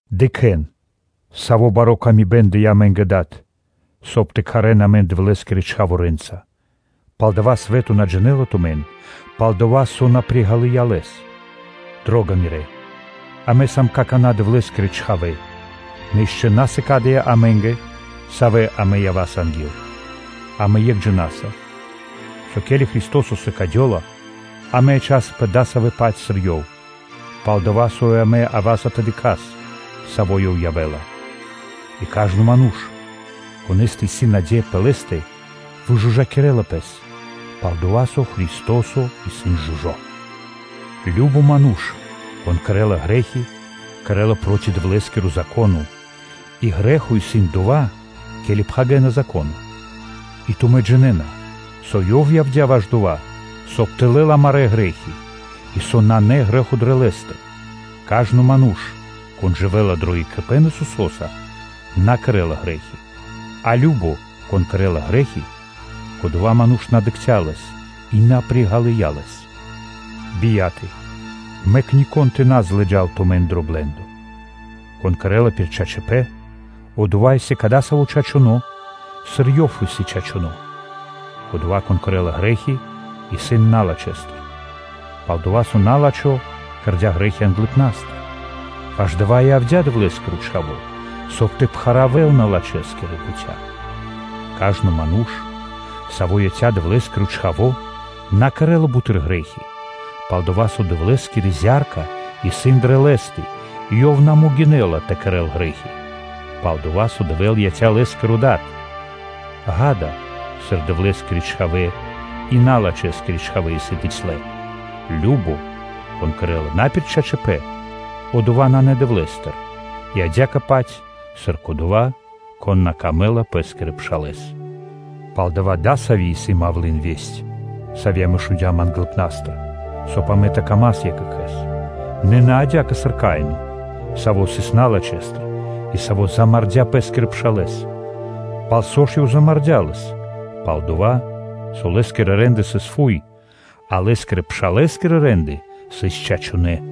Дыкхэ́н! Сави́ бари ра́дыма дыя́ амэ́нгэ Дад, соб (кай) тэ кхарэ́н амэн Дэвлэ́скирэ чхаворэнца. Палдава́ свэ́то на джинэ́ла тумэн, пал-дова́ со на приґалыя Лэс. Дро́га мирэ́! Амэ сам какана́ Дэвлэ́скирэ чхавэ́, нэ ишчо (инкэ́) на сыкадыя́ амэ́нгэ, савэ́ амэ ява́са анги́л. Амэ екх джина́са, со ке́ли Христо́со сыкадёла, амэ ячасапэ кадасавэ́-паць, сыр Ёв исын, пал-дова́ со амэ ява́са тэ дыкхас, саво́ Ёв явэ́ла. И кажно ману́ш, конэ́стэ исын наде́я пэ Лэ́стэ, выжужакирэ́ла (вычыстинэла) пэс, пал-дова́ со Христо́со исын жужо́. Кажно (сва́ко) ману́ш, кон кэрэ́ла грэ́хи, кэрэ́ла проти Дэвлэ́скиро Зако́но; и грэ́хо исын дова́, ке́ли пхагирэна Зако́но. И тумэ́ джинэ́на, со Ёв явдя́ ваш дова́, соб (кай) тэ лэл амарэ́ грэ́хи, и со нанэ грэ́хо дрэ Лэ́стэ. Кажно ману́ш, кон дживэ́ла дро екхипэ́н Исусо́са, на кэрэ́ла грэ́хи, а кажно, кон кэрэ́ла грэ́хи, кодова́ ману́ш на дыкхця́ Лэс и на приґалыя Лэс. Бияторалэ! Мэк нико́н тэ на лыджа́л тумэн дро блэ́ндо. Кон кэрэ́ла пир чачипэ́н, одова́ исын кадасаво́ чачуно́, сыр Ёв исын чачуно́. Кодова́, кон кэрэ́ла грэ́хи, исын налачхэстыр, пал-дова́ со на́лачхо кэрдя́ грэ́хи англыпна́стыр. Ваш дава́ и явдя́ Дэвлэ́скиро Чхаво́, соб (кай) тэ пхаравэл налачхэскирэ бутя́. Кажно ману́ш, саво́ яця́ Дэвлэ́скирэ чхавэ́са, на кэрэ́ла буты́р грэ́хи, пал-дова́ со Дэвлэ́скири зя́рка исын дрэ Лэ́стэ, и ёв на могинэ́ла тэ кэрэ́л грэ́хи, пал-дова́ со Дэвэ́л яця́ лэ́скирэ Дадэ́са. Ѓа́да, сыр Дэвлэ́скирэ чхавэ́ и налачхэскирэ чхавэ́ исын бицялэ: кажно (сва́ко), кон кэрэ́ла на пир чачипэ́н, одова́ нанэ Дэвлэ́стыр и адя́кэ-паць, сыр кодова́, кон на кэрэ́ла паты́в пэ́скирэ пшалэ́скэ. Палдава́ дасави́ исын мавлы́н (малва), сави́ амэ шундя́м англыпна́стыр, соб (кай) амэ тэ дас паты́в екх екхэ́скэ, нэ на адя́кэ, сыр Каино, саво́ сыс налачхэстыр и саво́ замардя́ (мулякирдя́) пэ́скирэ пшалэ́с. Пал со ж ёв замардя́ лэс? Пал-дова́ со лэ́скирэ рэ́нды сыс фуй, а лэ́скирэ-пшалэ́скирэ рэ́нды сыс чачунэ́.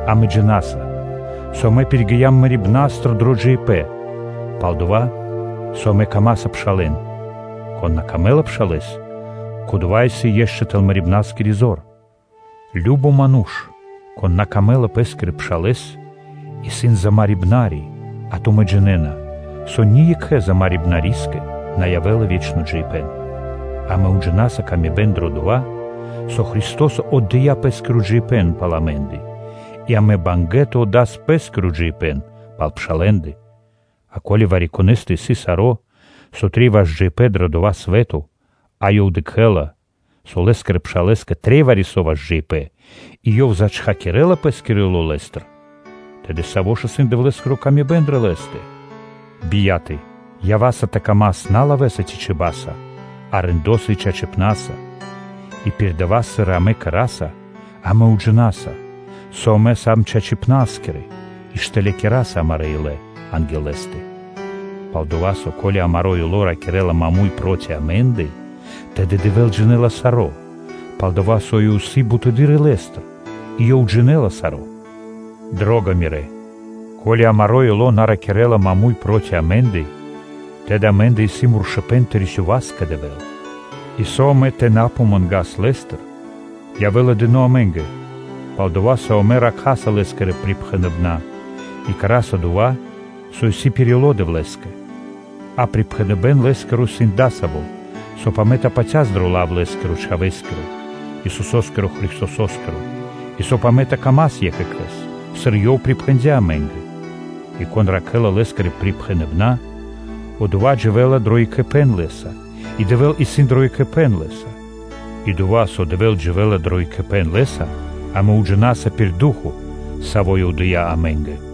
Амэ джина́са, со амэ пиригиям мэрибна́стыр дро джиибэ́н, пал-дова́ со амэ даса паты́в пшалэ́нгэ. Кон на дэ́ла паты́в пшалэ́скэ, кодова́ исын ишчо (инкэ́) тэл мэрибнаскири зор. Кажно (сва́ко) ману́ш, кон на дэ́ла паты́в пэ́скирэ пшалэ́скэ, исын замарибнари (умарибнари), а тумэ́ джинэ́на, со ни екхэ замарибнарискэ на явэ́ла ве́чно джиибэ́н. Амэ уджинаса пшалы́тко паты́в дро дава́, со Христо́со отдыя́ Пэ́скиро джиибэ́н пал амэ́ндэ; и амэ сам бангэ́ тэ отдас пэ́скиро джиибэ́н пал пшалэ́ндэ. А ко́ли вари-конэ́стэ исын саро́, со трэй ваш джиибэ́н дро дава́ свэ́то, а ёв дыкхэ́ла, со лэ́скирэ пшалэ́скэ трэй вари-со ваш джиибэ́н и ёв зачхакирэла пэ́скиро ило́ лэ́стыр, тэды сави́ жа исын Дэвлэ́скири ла́ска дрэ Лэ́стэ? Бияталэ, ява́са тэ дас паты́в на лавэ́са ци чиба́са, а рэндоса (делоса) и чачипна́са. И пир дава́, сыр амэ кэра́са, амэ уджинаса, со амэ сам чачипнаскирэ и штылякираса амарэ́ илэ анги́л Лэ́стэ; пал-дова́ со, ко́ли амаро́ ило́ ракирэ́ла маму́й проти амэ́ндэ, тэды Дэвэ́л джинэ́ла саро́, пал-дова́ со Ёв исын бутэды́р илэ́стыр, и Ёв джинэ́ла саро́. Дро́га мирэ́! Ко́ли амаро́ ило́ на ракирэ́ла маму́й проти амэ́ндэ, тэды амэ́ндэ исын муршыпэн тэ рисёвас кэ Дэвэ́л. И со амэ тэ на помангас Лэ́стыр, явэ́ла дыно́ амэ́нгэ, пал-дова́ со амэ ракхаса Лэ́скирэ припхэныбэна́ и кэра́са дова́, со исын пир ило́ Дэвлэ́скэ. А припхэныбэ́н Лэ́скиро исын дасаво: соб (кай) амэ тэ патяс дро лав Лэ́скирэ-Чхавэ́скирэ, Исусо́скирэ Христосо́скиро, и соб (кай) тэ дас паты́в екх екхэ́скэ, сыр Ёв припхэндя́ амэ́нгэ. И кон ракхэ́ла Лэ́скирэ припхэныбэна́, одова́ дживэ́ла дро екхипэ́н Лэ́са, и Дэвэ́л исын дро екхипэ́н Лэ́са. И дова́, со Дэвэ́л дживэ́ла дро екхипэ́н Лэ́са, амэ уджинаса пир Ду́хо (Фа́но), Саво́ Ёв дыя́ амэ́нгэ.